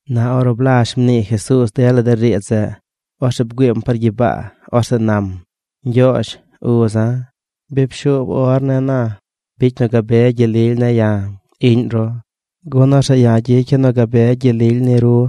Na ornu blazh mnii Jesuuz dela de riidz zeꞌ, orzeꞌ bgüiim par gyibaa. Orzeꞌ nam: ―Ñgyoozh, uza̱, bi pshuub or ne̱ na. Bicy nu gabe gyel lily ne̱ ya̱, iꞌñ ru, gun orzeꞌ ya̱ gyicya̱ nu gabe gyel lily ni ru.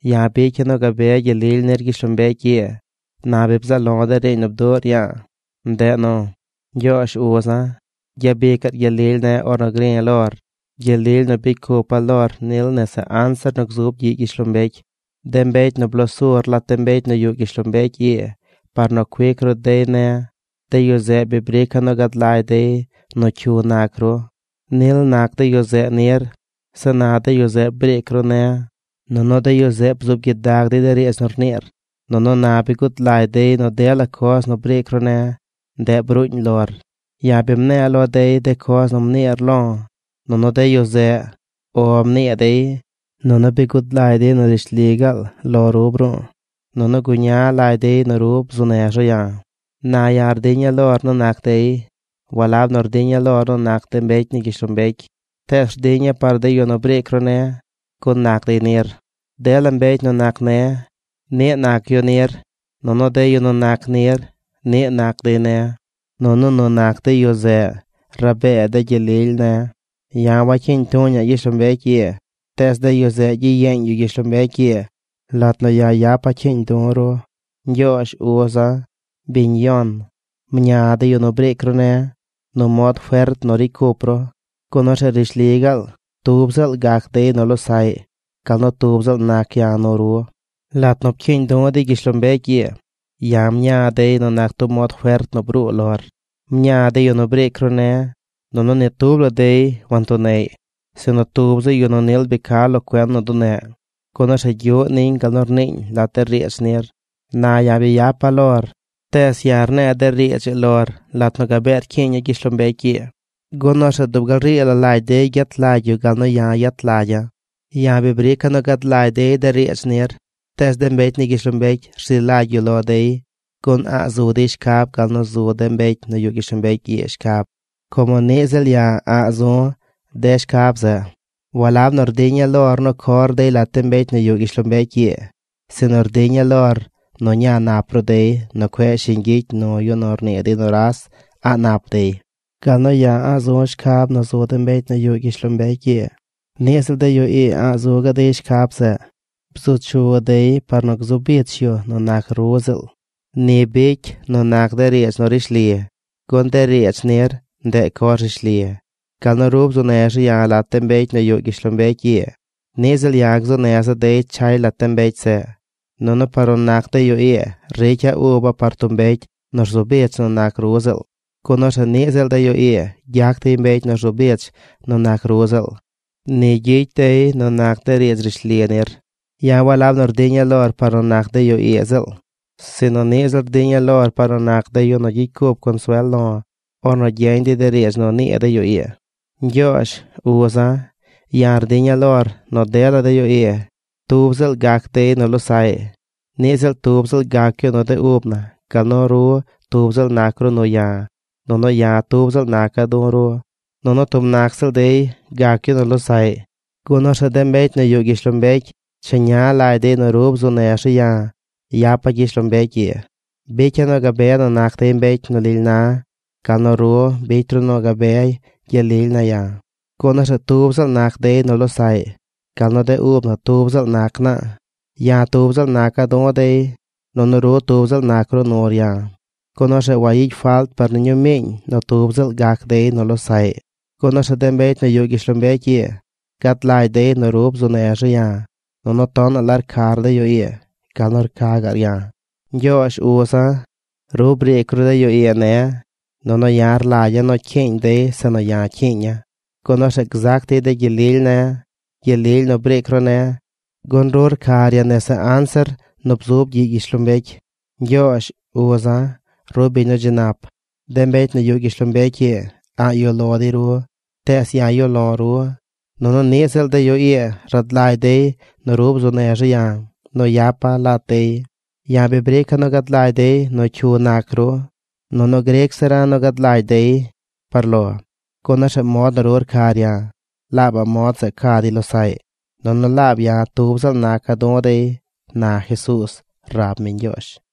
’Ya̱ bicya̱ nu gabe gyel lily nir gyishlombecy ii. Na bi bzaꞌ lo̱ de riiñ nu bduꞌr ya̱a̱. Ndeꞌ nu, Ñgyoozh, uza̱, gyabicaꞌr gyel lily ne̱ ornu gri̱ lor, gyel lily nu bicy cupa̱ lor nil nese anzir nu gzub gyiꞌ gyishlombecy. ’De mbecy nu bloo sur lat de mbecy nu yuꞌ gyishlombecy ii par nu cuic ru dey ne̱, de yu zeꞌ bi brica̱ nu gad lagy dey nu cyu nac ru. Nil nac de yu zeꞌ nir. Zeꞌ na de yu zeꞌ briic ru ne̱. Nunu de yu zeꞌ bzuub gyidag dey de riidz nu rniir, nunu na bi gud lagy dey nu dela coz nu briic ru ne̱, ndeꞌ bruuñ lor. Ya̱ bi mne̱e̱ lo dey de coz nu mniir lo̱, nunu de yu zeꞌ “O” mnii dey. Nunu bi gud lagy dey nu rishli gaal lo ru bru̱u̱. Nunu guña lagy dey nu ru bzuu nez ru ya̱. ’Na ya̱ rdiña̱ lor nu nac dey. Walab nu rdiña̱ lor nu nac de mbecy ni gyishlombecy. Tees rdiña̱ par de yu nu briic ru ne̱, gun nac dey nir. Dela mbecy nu nac ne̱, niꞌ nac yu nir. Nunu de yu nu nac nir, niꞌ nac dey ne̱. Nunu nu nac de yu zeꞌ rabee de gyel lily ne̱. Ya̱ wacyiiñ tuña̱ꞌ gyishlombecy ii. Tees de yu zeꞌ gyiyeeñ yu gyishlombecy ii lat nu ya̱ yapa̱ cyiiñ du̱ ru. Ñgyoozh, uza̱, biñ yon, mña de yu nu briic ru ne̱ nu mod fert nu ricy cup ru, gun orzeꞌ rishli gaal tub ziꞌl gac dey nu losaꞌy gal nu tub ziꞌl nac ya̱ nu ru. Lat nu pcyiiñ du̱ dey gyishlombecy ii, ya̱ mña̱ dey nu nac tub mod fert nu bruu lor. Mña̱ de yu nu briic ru ne̱. Nunu ni tub la dey wantuneꞌy, sinu tub zi yu nu nil bi ca lo cuen nu duneꞌ. Gun orzeꞌ gyuꞌ niñ gal nu rniiñ lat de riidz nir. ’Na ya̱ bi yapa̱ lor. Tees ya̱ rne̱e̱ de riidz ii lor lat nu gabee rcyiiña̱ gyishlombecy ii, gun orzeꞌ dub gal rii la lagy dey gyet lagy yu gal nu ya̱ yet lagya̱. Ya̱ bi brica̱ nu gad lagy dey de riidz nir. Tees de mbecy ni gyishlombecy rzi lagy yu lo dey gun a̱ꞌ zu dey shcab gal nu zu de mbecy nu yuꞌ gyishlombecy ii shcab, como niꞌ ziꞌl ya̱ a̱ꞌ zu̱ de shcab zeꞌ. Walab nu rdiña̱ lor nu cor dey lat de mbecy nu yuꞌ gyishlombecy ii, sinu rdiña̱ lor nu ña nap ru dey nu cueꞌ shiñ gyicy nu yu nu rnii dey nuras a̱ꞌ nap dey. Gal nu ya̱ a̱ꞌ zu̱ shcab nu zu de mbecy nu yuꞌ gyishlombecy ii, niꞌ ziꞌl de yu ii a̱ꞌ zu gaꞌ dey shcab zeꞌ. Bzu chu dey par nu gzu bich yu nu nac ru ziꞌl. Ni bicy nu nac de riidz nu rishli. Gun de riidz nir, ndeꞌ coz rishli. Gal nu ru bzuu nez ru ya̱ lat de mbecy nu yuꞌ gyishlombecy ii, niꞌ ziꞌl ya̱ gzuu neza̱ dey chay lat de mbecy zeꞌ. Nunu par nu nac de yu ii ricya̱ uba̱ par tub mbecy nu rzu bich nu nac ru ziꞌl, gun orzeꞌ niꞌ ziꞌl de yu ii gyac dey mbecy nu rzu bich nu nac ru ziꞌl. Ni gyicy dey nu nac de riidz rishli nir. ’Ya̱ walab nu rdiña̱ lor par nu nac de yu ii ziꞌl, sinu niꞌ ziꞌl rdiña̱ lor par nu nac de yu nu gyicy cup consuel lo̱ ornu gyeñ dey de riidz nu nii de yu ii. Ñgyoozh, uza̱, ya̱ rdiña̱ lor nu dela de yu ii, tub ziꞌl gac dey nu losaꞌy. Niꞌ ziꞌl tub ziꞌl gac yu nu de ub na gal nu ru tub ziꞌl nac ru nu ya̱ nunu ya̱ tub ziꞌl naca̱ du̱ ru. Nunu tub nac ziꞌl dey gac yu nu losaꞌy, gun orzeꞌ de mbecy nu yuꞌ gyishlombecy cheña lagy dey nu ru bzuu nez ru ya̱ yapa̱ gyishlombecy ii. Bicya̱ nu gabe nu nac dey mbecy nu lily na gal nu ru bicy ru nu gabe gyel lily ne̱ ya̱, gun orzeꞌ tub ziꞌl nac dey nu losaꞌy gal nu de ub na tub ziꞌl nac naa. Ya̱ tub ziꞌl naca̱ du̱ dey, nunu ru tub ziꞌl nac ru nur ya̱, gun orzeꞌ wayicy falt par ni ñuu miiñ nu tub ziꞌl gac dey nu losaꞌy, gun orzeꞌ de mbecy nu yuꞌ gyishlombecy ii gad lagy dey nu ru bzuu nez ru ya̱, nunu tonaꞌ la rcar de yu ii gal nu rca gaꞌr ya̱. ’Ñgyoozh, uza̱, ru briic ru de yu ii ne̱, nunu ya̱ rlagya̱ nu cyiiñ dey zeꞌ nu ya̱ cyiiña̱, gun orzeꞌ gzac dey de gyel lily ne̱: gyel lily nu briic ru ne̱. Gun ru rcar ya̱ nese anzir nu bzub gyiꞌ gyishlombecy. Ñgyoozh, uza̱, ru biñ nu dzi nap. De mbecy nu yuꞌ gyishlombecy ii a̱ꞌ yuꞌ lo dey ru. Tees ya̱ yuꞌ lo̱ ru. Nunu niꞌ ziꞌl de yu ii rad lagy dey nu ru bzuu nez ru ya̱ nu yapa̱ lat dey. Ya̱ bi brica̱ nu gad lagy dey nu cyu nac ru, nunu gric zira̱ nu gad lagy dey par lo, gun orzeꞌ mod nu ru rcar ya̱, laabaꞌ mod zeꞌ ca dey losaꞌy. Nunu laab ya̱ tub ziꞌl naca̱ du̱ dey ―na Jesuuz rab mi Ñgyoozh.